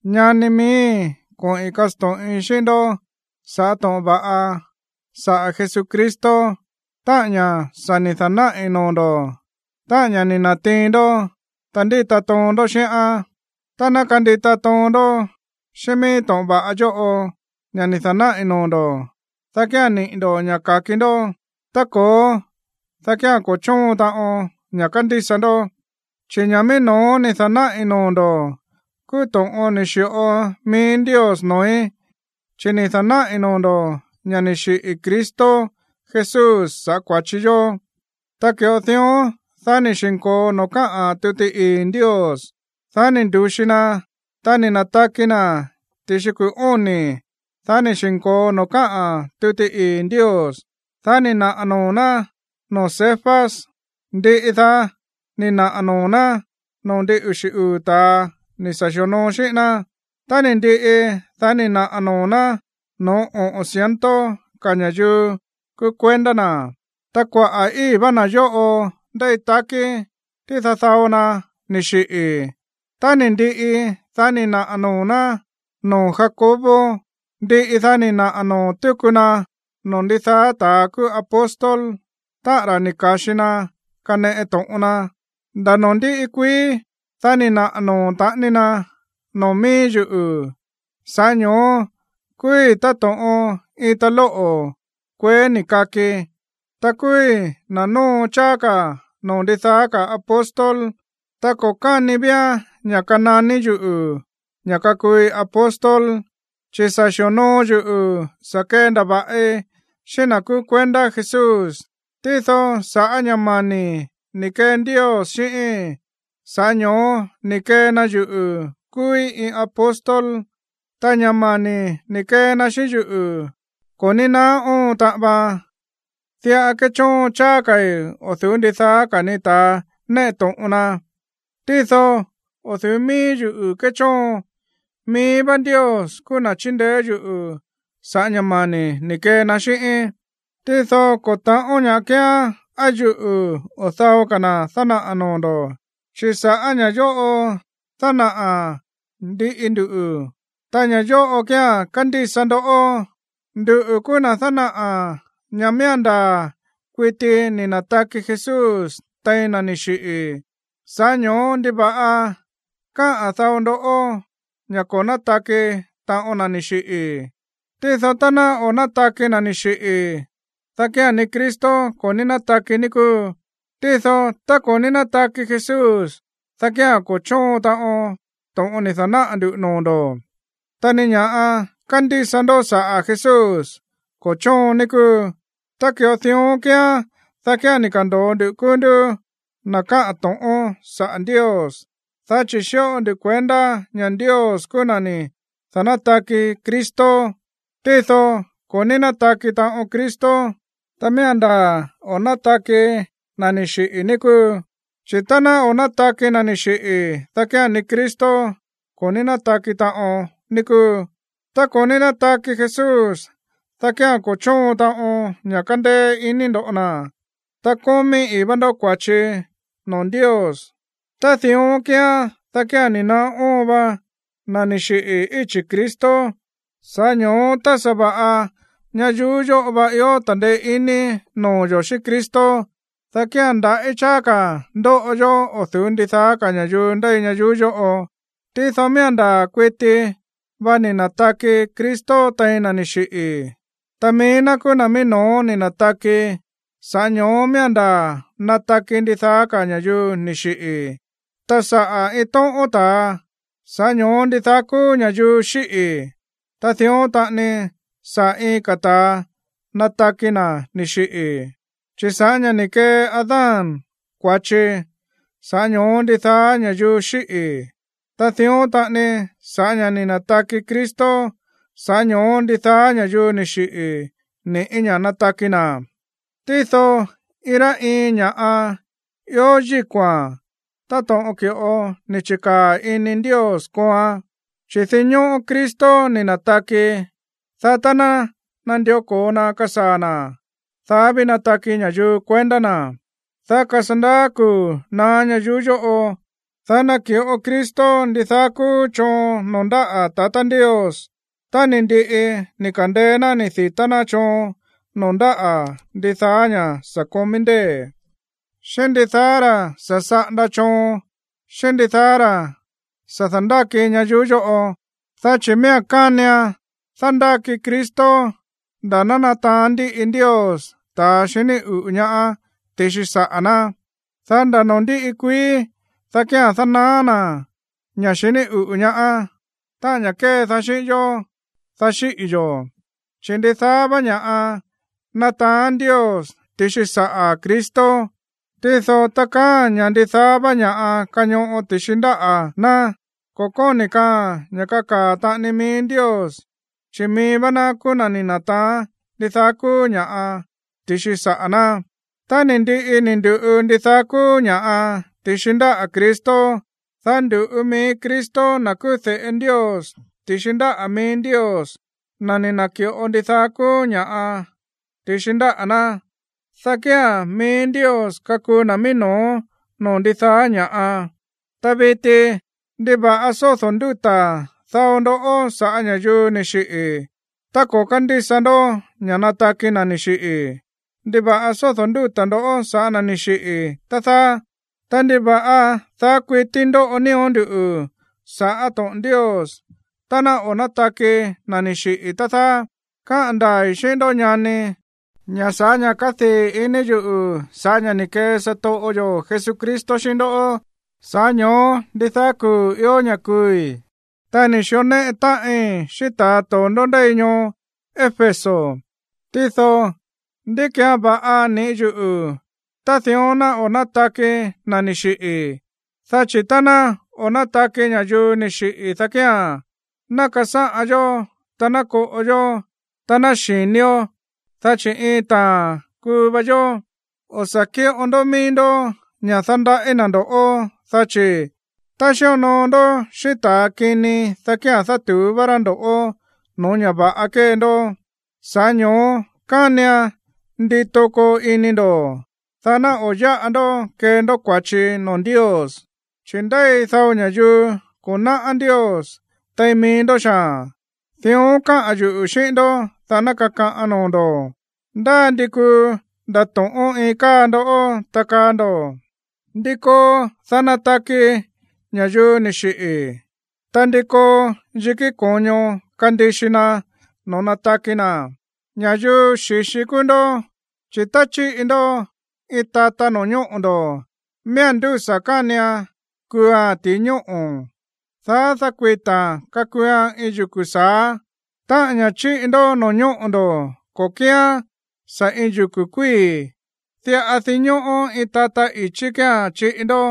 Ñani miíi̱, koꞌi̱n kasto̱ꞌin xíꞌín ndó sa̱ꞌá to̱ꞌon va̱ꞌa saꞌa̱ Jesucristo, táꞌa̱n ña̱ sa̱ ni̱ da̱náꞌi̱ noo̱ ndo̱, táꞌa̱n ña̱ ni̱ na̱tiin ndó, ta ndíta toon ndó xíꞌán. Tá ná kandita toon ndó xíꞌín mií to̱ꞌon va̱ꞌa yóꞌo, ña̱ ni̱ da̱náꞌi̱ noo̱ ndo̱, dá kía̱n niꞌi̱ ndo̱ ña̱ ka̱ki ndó. Tá ko̱ó, dá kía̱n ko̱ chóon taꞌon ña̱ kándísa ndó. Chi̱ ña̱ mií no̱ó ni̱ da̱náꞌi̱ noo̱ ndo̱ kúú to̱ꞌon ni̱ xi̱ꞌo mií Ndios noo̱í, chi̱ ni̱ da̱náꞌi̱ noo̱ ndo̱ ña̱ ni̱ xiꞌi̱ Cristo Jesús sa̱ꞌá kua̱chi yó, tá ki̱ꞌo dión, dá ni̱ xi̱nko̱o noo̱ káꞌa̱n tuti ii̱ Ndios. Dá ni̱ ndu̱xi na. Ta ni̱ na̱taki na̱ ti̱xi kuu̱ óni̱, dá ni̱ xi̱nko̱o noo̱ káꞌa̱n tuti ii̱ Ndios. Dá ni̱ naꞌa̱ noo̱ ná noo̱ Cefas. Ndiꞌi daá ni̱ naꞌa̱ noo̱ ná noo̱ ndin uxi̱ uu̱ ta̱a ni̱ sa̱ xi̱onoo xíꞌín ná. Tá ni̱ ndiꞌi, dá ni̱ naꞌa̱ noo̱ ná no̱ó oꞌo̱n ciento ka̱ ña̱yuu kúú kuendá na̱. Ta kuaꞌa̱ i̱í vá na̱ yóꞌo ndéi takí, tído dao na ni̱ xiꞌi̱. Tá ni̱ ndiꞌi, dá ni̱ naꞌa̱ noo̱ ná noo̱ Jacobo. Ndiꞌi, dá ni̱ naꞌa̱ noo̱ túku na noo̱ ndidaá ta̱a kúú apóstol, táꞌa̱n ra̱ ni̱ ka̱xi na kaneꞌe to̱ꞌon na. Nda̱ noo̱ ndíꞌi kuií, dá ni̱ naꞌa̱ noo̱ taꞌani na noo̱ mií yuꞌu̱, sa̱ꞌá ño̱ó kúúí táto̱ꞌon iin talóꞌo̱ kueé ni̱ kaki. Ta kúúí na̱ nóo cháá ka̱ no̱ó ndidaá ka̱ apóstol, ta ko̱ káni vía̱n ña̱ kananí yuꞌu̱ ña̱ kakuui apóstol, chi̱ sa̱ xi̱onoo yuꞌu̱ sa̱ kendava̱ꞌi xíꞌín na̱ kúú kuendá Jesús. Tído sa̱ꞌá ña̱ mani̱ ni̱ kee Ndios xíꞌíín, sa̱ꞌá ño̱ó ni̱ kee na yuꞌu̱ kúúí iin apóstol. Ta ña̱ mani̱ ni̱ kee na xíꞌín yuꞌu̱, ko̱ ní naá óon taꞌan vaan. Diꞌa kéchóon cháá ka̱i̱ o̱ du̱ú ndidaá ka̱ ni ta̱a néꞌe to̱ꞌon na. Tído o̱ du̱ú míí yuꞌu̱ kéchóon, mií vá Ndios kúú na̱ chíndeé yuꞌu̱ sa̱ꞌá ña̱ mani̱ ni̱ kee na xíꞌíín. Tído ko̱ ta̱ꞌón ña̱ꞌa kíán á yuꞌu̱ o dao ka̱ na̱ dánaꞌa̱ noo̱ ndo̱. Chi̱ sa̱ꞌá ña̱ yóꞌo dánaꞌa̱ ndiꞌi ndu, ta ña̱ yóꞌo kía̱n kándísa ndó. Nduꞌu̱ kúú na̱ dánaꞌa̱ ña̱ miía̱n ndaa̱ kuiti ni̱ na̱taki Jesús tein na̱ ni̱ xiꞌi̱, sa̱ꞌá ño̱ó, ¿ndiva̱ꞌa káꞌa̱n dao ndó ña̱ o̱ nátaki taꞌon na̱ ni̱ xiꞌi̱? Tído tá ná o̱ nátaki na̱ ni̱ xiꞌi̱, dá kía̱n ni Cristo ko̱ ní nátaki, ní kúu. Tído tá ko̱ ní nátaki Jesús, dá kía̱n ko̱ chóon taꞌon to̱ꞌon ni̱ da̱náꞌa̱ ndu̱ noo̱ ndo̱, ta ni ña̱ kándísa ndó saꞌa̱ Jesús ko̱ chóon, ní kúu. Tá ki̱ꞌo dión kíán, dá kía̱n ni̱ ka̱ndo̱o ndu kúú ndú na̱ káꞌa̱n to̱ꞌón saꞌa̱ Ndios, dá chi̱ xíꞌo ndu kuendá ña̱ Ndios kúú na̱ ni̱ da̱nátaki Cristo. Tído ko̱ ní nátaki taꞌon Cristo tá miía̱n ndaa̱ o̱ nátaki na̱ ni̱ xiꞌi̱, ní kúu. Chi̱ tá ná o̱ nátaki na̱ ni̱ xiꞌi̱, dá kía̱n ni Cristo ko̱ ní nátaki taꞌon, ní kúu. Tá ko̱ ní nátaki Jesús, dá kía̱n ko̱ chóon taꞌon ña̱ kándéé iní ndo̱ ná, ta kómí ii̱ vá ndó kua̱chi noo̱ Ndios. Tá dión kíán, dá kía̱n ni̱ naá óon va na̱ ni̱ xiꞌi̱ íchi̱ Cristo. Sa̱ꞌá ño̱ó tá sa̱va̱ꞌa ñayuú yóꞌo va ió ta̱ndeé iní noo̱ yo̱ xíꞌín Cristo, dá kía̱n ndaꞌí cháá ka̱ ndóꞌo yó o̱ du̱ú ndidaá ka̱ ña̱yuu ndéi ñayuú yóꞌo. Tído miía̱n ndaa̱ kuiti va ni̱ na̱taki Cristo tein na̱ ni̱ xiꞌi̱, ta mií ná kúú na̱ mií no̱ó ni̱ na̱taki, sa̱ꞌá ño̱ó miía̱n ndaa̱ nataki ndidaá ka̱ ña̱yuu ni̱ xiꞌi̱. Ta sa̱ꞌá iin tóꞌón ta̱a, sa̱ꞌá ño̱ó ndidaá kúú ña̱yuu xíꞌi̱. Ta dión taꞌani sa̱ꞌá iin ka̱ ta̱a nataki na̱ ni̱ xiꞌi̱. Chi̱ sa̱ꞌá ña̱ ni̱ kee Adán kua̱chi, sa̱ꞌá ño̱ó ndidaá ña̱yuu xíꞌi̱. Ta dión taꞌani, sa̱ꞌá ña̱ ni̱ na̱taki Cristo, sa̱ꞌá ño̱ó ndidaá ña̱yuu ni̱ xiꞌi̱ ni̱ꞌí ña̱ nataki na̱. Tído iin rá iin ña̱ꞌa ió yíko̱a̱n táto̱ꞌon ki̱ꞌo ni̱ chi̱kaa̱ ini Ndios kooan. Chi̱ dinñóꞌó Cristo ni̱ na̱taki, dá tá ná nandió ko̱o na kasaa̱ na̱, dá ví nataki ña̱yuu kuendá na̱. Dá kasandaá kuu̱ naá ñayuú yóꞌo, dá naki̱ꞌo Cristo ndidaá kúú choon noo̱ ndáꞌa̱ tatá Ndios tá ni̱ ndiꞌi ni̱ ka̱ndeé ná ni̱ di̱tá ná choon noo̱ ndáꞌa̱ ndidaá ña̱ sa̱ komí ndée̱, xíꞌín ndidaá ra̱ sa̱ saꞌanda choon xíꞌín ndidaá ra̱ sa̱ da̱ndáki ñayuú yóꞌo. Dá chi̱ miía̱n kánian dándáki Cristo nda̱ ná nataán ndiꞌi Ndios ta̱ xiní uꞌu̱ ñaá ti̱xi saꞌa̱ ná. Dá nda̱ noo̱ ndíꞌi kuií, dá kía̱n dánaá na̱ ña̱ xiní uꞌu̱ ñaá, táꞌa̱n ña̱ kédaá xíꞌín yó, dá xíꞌi̱ yo̱. Chi̱ ndidaá vá ña̱ꞌa nataán Ndios ti̱xi saꞌa̱ Cristo. Tído tá kaáa̱n ña̱ ndidaá vá ña̱ꞌa kañoꞌo ti̱xi ndáꞌa̱ ná, ko̱ kóni̱ kaaa̱n ña̱ kakaa̱ taꞌani mií Ndios, chi̱ mií vá ná kúú na̱ ni̱ na̱taán ndidaá kúú ña̱ꞌa ti̱xi saꞌa̱ ná. Tá ni̱ ndiꞌi ni̱ ndu̱ꞌu ndidaá kúú ña̱ꞌa ti̱xi ndáꞌa̱ Cristo, dá ndu̱ꞌu mií Cristo, na̱ kúú de̱ꞌe Ndios, ti̱xi ndáꞌa̱ mií Ndios, na̱ ni̱ na̱ki̱ꞌo ndidaá kúú ña̱ꞌa ti̱xi ndáꞌa̱ ná. Dá kía̱n mií Ndios kakuu na̱ mií no̱ó noo̱ ndidaá ña̱ꞌa. Ta viti, ¿ndiva̱ꞌa sódo̱ ndúta̱ dao ndó sa̱ꞌá ña̱yuu ni̱ xiꞌi̱ tá ko̱ kándísa ndó ña̱ nataki na̱ ni̱ xiꞌi̱? ¿Ndiva̱ꞌa sódo̱ ndúta̱ ndo̱ sa̱ꞌá na̱ ni̱ xiꞌi̱, tá dáá? Ta, ¿ndiva̱ꞌa daá kuití ndóꞌo nío̱ nduꞌu̱ sa̱ꞌá to̱ꞌon Ndios tá ná o̱ nátaki na̱ ni̱ xiꞌi̱, tá dáá? Káꞌa̱n ndaa̱i̱ xíꞌín ndó, ñani, ña̱ sa̱ꞌá ña̱ kádii̱ ini yuꞌu̱ sa̱ꞌá ña̱ ni̱ kee satoꞌo yo̱ Jesucristo xíꞌín ndó, sa̱ꞌá ño̱ó ndidaá kuu̱ vá ió ña̱ kuui̱. Ta ni̱ xió néꞌe táꞌin xíꞌín ta̱ to̱ndó ndéi ñoo Éfeso, tído, ¿ndí ki̱án va̱ꞌa niꞌi̱ yuꞌu̱ tá dión ná o̱ nátaki na̱ ni̱ xiꞌi̱? Dá chi̱ tá ná o̱ nátaki ña̱yuu ni̱ xiꞌi̱, dá kía̱n: “Ná kasáꞌan yó, ta ná koꞌo yó, ta ná xi̱nió, dá chi̱ iin taa̱n kuu va yó.” O̱ sa̱ kíꞌo ndó mií ndó ña̱ dándaꞌí na̱ ndo̱ꞌó, dá chi̱: “Tá xíonoo ndó xíꞌín ta̱a kini, dá kía̱n dátu̱ú vá rá ndo̱ꞌó no̱ó ña̱ va̱ꞌa kée ndó.” Sa̱ꞌá ño̱ó kánian ndito koo ini ndo̱, dá ná o̱ yáꞌa ndó kee ndó kua̱chi noo̱ Ndios. Chi̱ ndéi dao ña̱yuu ko̱ náꞌá Ndios tein mií ndó xaa̱n. Dión káꞌa̱n yuꞌu̱ xíꞌín ndó, dá ná kakaꞌan noo̱ ndo̱. Ndá ndi kuu ndato̱ꞌón iin káa ndoꞌó, ta kaa ndo̱: “¿Ndí koo, dá nataki ña̱yuu ni̱ xiꞌi̱? ¿Ta ndi koo yikí ko̱ño kandixi na noo̱ nataki na̱?” Ña̱yuu xi̱xi kúú ndó. Chi̱ tá chíꞌi ndó iin tata no̱ñóꞌo̱ ndo̱, miía̱n ndúsa̱ kánian kuua̱n ti̱i ñóꞌo̱, dá dákuita̱a̱n kakuuan iin yuku̱ sa̱á. Ta ña̱ chíꞌi ndó no̱ñóꞌo̱ ndo̱ ko̱ kíán sa̱ iin yuku̱ kuíi̱, diꞌa dinñóꞌó iin tata i̱chí kía̱n chíꞌi ndó,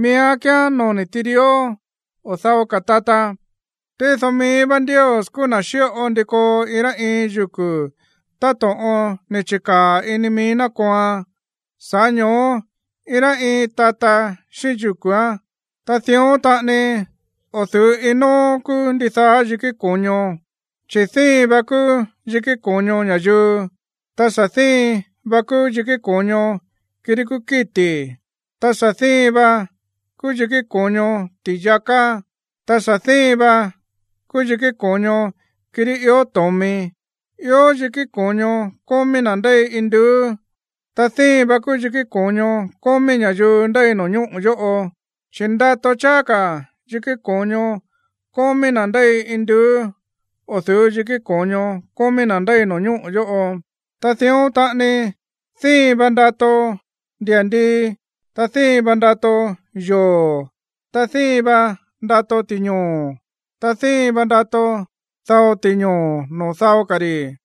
miía̱n kíán noni̱ tirió o dao ka̱ tata. Tído mií vá Ndios kúú na̱ xíꞌo ndi koo iin rá iin yuku̱ táto̱ꞌon ni̱ chi̱kaa̱ ini mií ná kooan, sa̱ꞌá ño̱ó iin rá iin tata xíꞌín yuku̱án. Ta dión taꞌani o̱ du̱ú iin nóó kúú ndidaá yikí ko̱ño. Chi̱ díin vá kúú yikí ko̱ño ña̱yuu, ta sa̱ díin vá kúú yikí ko̱ño kirí kúú kíti̱. Ta sa̱ díin vá kúú yikí ko̱ño ti̱yaká, ta sa̱ díin vá kúú yikí ko̱ño kirí ió to̱mi. Ió yikí ko̱ño kómí na̱ ndéi induú, ta díin vá kúú yikí ko̱ño kómí ña̱yuu ndéi no̱ñóꞌo̱ yóꞌo. Chi̱ ndato cháá ka̱ yikí ko̱ño kómí na̱ ndéi induú o̱ du̱ú yikí ko̱ño kómí na̱ ndéi no̱ñóꞌo̱ yóꞌo. Ta dión taꞌani díin vá ndato ndia̱ndii, ta díin vá ndato yoo̱. Ta díin vá ndato ti̱ñoo̱. Ta díin vá ndato dao ti̱ñoo̱ noo̱ dao ka̱ ri̱.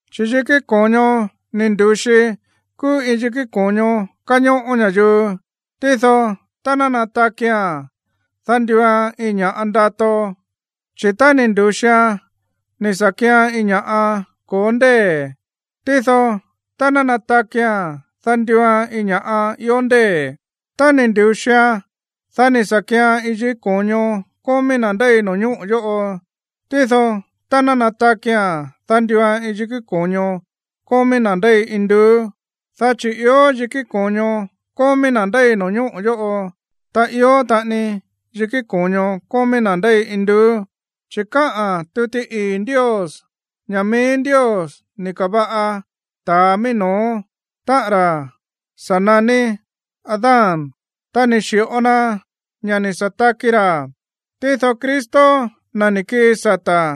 Chi̱ yikí ko̱ño ni̱ ndu̱xi kúú iin yikí ko̱ño kañóꞌó ña̱yuu. Tído tá ná natakia̱n, dá nduuan iin ña̱ꞌa ndato. Chi̱ tá ni̱ ndu̱xian ni̱ sa̱ kian iin ña̱ꞌa ko̱ó ndée̱. Tído tá ná natakia̱n, dá nduuan iin ña̱ꞌa ió ndée̱. Tá ni̱ ndu̱xian, dá ni̱ sa̱ kíán iin yikí ko̱ño kómí na̱ ndéi no̱ñóꞌo̱ yóꞌo. Tído tá ná natakia̱n, dá nduuan iin yikí ko̱ño kómí na̱ ndéi induú. Dá chi̱ ió yikí ko̱ño kómí na̱ ndéi no̱ñóꞌo̱ yóꞌo, ta ió taꞌani yikí ko̱ño kómí na̱ ndéi induú. Chi̱ káꞌa̱n tuti ii̱ Ndios ña̱ mií Ndios ni̱ ka̱va̱ꞌa ta̱a mií no̱ó, táꞌa̱n ra̱ sa̱ naní Adán, ta ni̱ xi̱ꞌo na ña̱ ni̱ sa̱ taki ra̱. Tído Cristo, na̱ ni̱ kii sata̱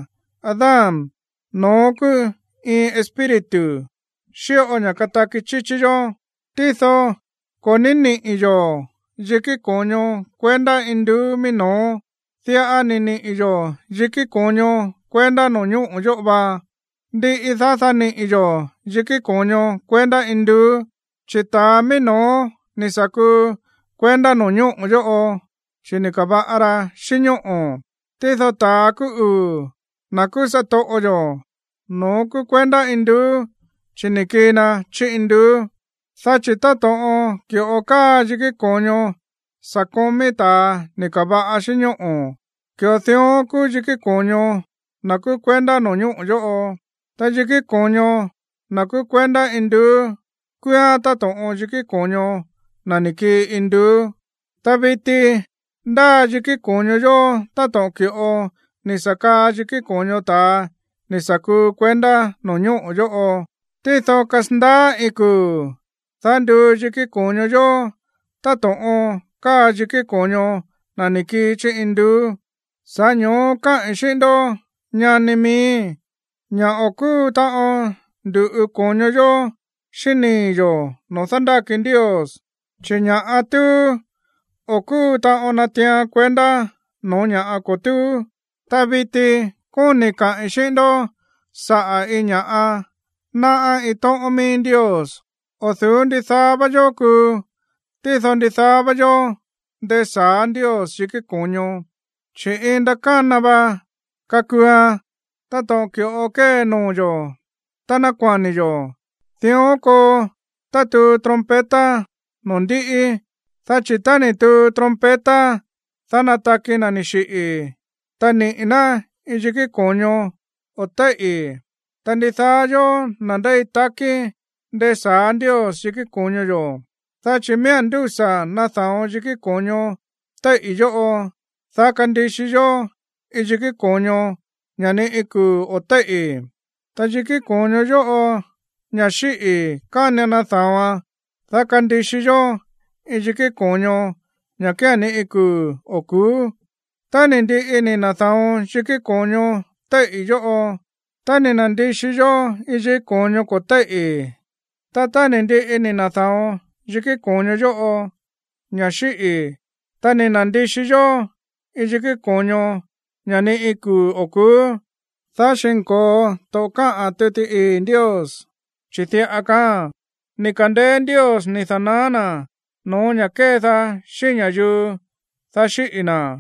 Adán, no̱ón kúú iin Espíritu xíꞌo ña̱ kataki chíchí yó. Tído ko̱ ní niꞌi̱ yo̱ yikí ko̱ño kuendá induú mií no̱ó, diꞌa ni̱ niꞌi̱ yo̱ yikí ko̱ño kuendá no̱ñóꞌo̱ yóꞌo va. Ndiꞌi, dá niꞌi̱ yo̱ yikí ko̱ño kuendá induú. Chi̱ ta̱a mií no̱ó ni̱ sa̱ kuu kuendá no̱ñóꞌo̱ yóꞌo, chi̱ ni̱ ka̱va̱ꞌa ra xíꞌín ñóꞌo̱. Tído ta̱a kúú uu̱, na̱ kúú satoꞌo yo̱, no̱ón kúú kuendá induú, chi̱ ni̱ kii na chí induú. Dá chi̱ táto̱ꞌon ki̱ꞌo káa yikí ko̱ño sa̱ komí ta̱a ni̱ ka̱va̱ꞌa xíꞌín ñóꞌo̱, ki̱ꞌo dión kúú yikí ko̱ño na̱ kúú kuendá no̱ñóꞌo̱ yóꞌo. Ta yikí ko̱ño na̱ kúú kuendá induú kúúán táto̱ꞌon yikí ko̱ño na̱ ni̱ kii induú. Ta viti ndáa yikí ko̱ño yo̱ táto̱ꞌon ki̱ꞌo ni̱ sa̱ kaa yikí ko̱ño ta̱a ni̱ sa̱ kuu kuendá no̱ñóꞌo̱ yóꞌo. Tído kasandaá iin kuu̱, dá nduu yikí ko̱ño yo̱ táto̱ꞌon káa yikí ko̱ño na̱ ni̱ kii chí induú. Sa̱ꞌá ño̱ó káꞌi̱n xíꞌín ndó, ñani miíi̱, ña̱ o̱ kúu taꞌon ndu̱ꞌu ko̱ño yo̱ xíꞌín nii̱ yo̱ noo̱ dándáki Ndios. Chi̱ ña̱ꞌa túú, o̱ kúu taꞌon natiian kuendá no̱ó ña̱ꞌa ko̱ túú. Ta viti kóni̱i̱ kaꞌi̱n xíꞌín ndó saꞌa̱ iin ña̱ꞌa náꞌá iin tóꞌón mií Ndios. O̱ du̱ú ndidaá vá yó kuu, tído ndidaá vá yó ndesa̱á Ndios yikí ko̱ño, chi̱ iin ndakána va kakuuan, táto̱ꞌon ki̱ꞌo kée noo̱ yo̱ tá nákua̱ni̱ yo̱. Dión koo tá tuu trompeta noo̱ ndiꞌi. Dá chi̱ tá ni̱ tuu trompeta, dá nataki na̱ ni̱ xiꞌi̱, ta niꞌi̱ ná iin yikí ko̱ño o̱ téíꞌi̱. Ta ndidaá yó, na̱ ndéi takí, ndesa̱á Ndios yikí ko̱ño yo̱. Dá chi̱ miía̱n ndúsa̱ nada̱on yikí ko̱ño téíꞌi̱ yóꞌo, dá kandixi yó iin yikí ko̱ño, ña̱ ni̱ iin kuu̱ o̱ téíꞌi̱. Ta yikí ko̱ño yóꞌo, ña̱ xíꞌi̱, kánian nada̱oan, dá kandixi yó iin yikí ko̱ño, ña̱ kía̱n ni iin kuu̱ o̱ ku̱ú. Tá ni̱ ndiꞌi ni̱ na̱da̱on yikí ko̱ño téíꞌi̱ yóꞌo, ta ni̱ na̱ndixi yó iin yikí ko̱ño ko̱ téíꞌi̱, ta tá ni̱ ndiꞌi ni̱ na̱da̱on yikí ko̱ño yóꞌo, ña̱ xíꞌi̱, ta ni̱ na̱ndixi yó iin yikí ko̱ño, ña̱ ni iin kuu̱ o̱ ku̱ú, dá xi̱nko̱o to̱ꞌon káꞌa̱n tuti ii̱ Ndios, chi̱ diꞌa kaáa̱n: “Ni̱ ka̱ndeé Ndios ni̱ da̱naá na̱ no̱ó ña̱ kédaá xíꞌín ña̱yuu, dá xíꞌi̱ na̱.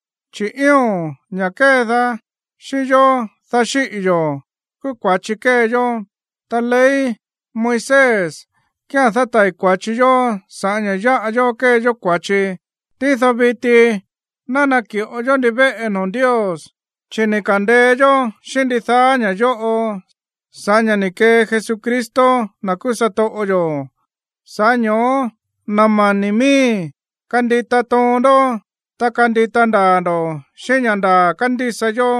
Chi̱ ío̱n, ña̱ kédaá xíꞌín yó, dá xíꞌi̱ yo̱, kúú kua̱chi kée yó. Ta ley Moisés kía̱n dátai̱ kua̱chi yó sa̱ꞌá ña̱ yáꞌa yó kee yó kua̱chi. Tído viti ná naki̱ꞌo yó ndivéꞌe noo̱ Ndios, chi̱ ni̱ ka̱ndeé yó xíꞌín ndidaá ña̱ yóꞌo sa̱ꞌá ña̱ ni̱ kee Jesucristo, na̱ kúú satoꞌo yo̱. Sa̱ꞌá ño̱ó, na̱ mani̱ miíi̱, kandita toon ndó, ta kandita ndaa̱ ndo̱ xíꞌín ña̱ ndaa̱ kándísa yó.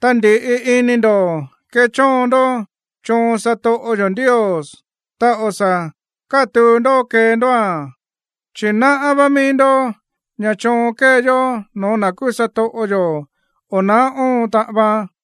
Ta ndi̱ꞌi ini ndo̱ kechóon ndó choon satoꞌo yo̱ Ndios, ta o̱ sa̱ kátuu ndó kee ndóa̱n. Chi̱ náꞌá vá mií ndó ña̱ choon kée yó no̱ó na̱ kúú satoꞌo yo̱, o̱ na̱á óon taꞌan vaan.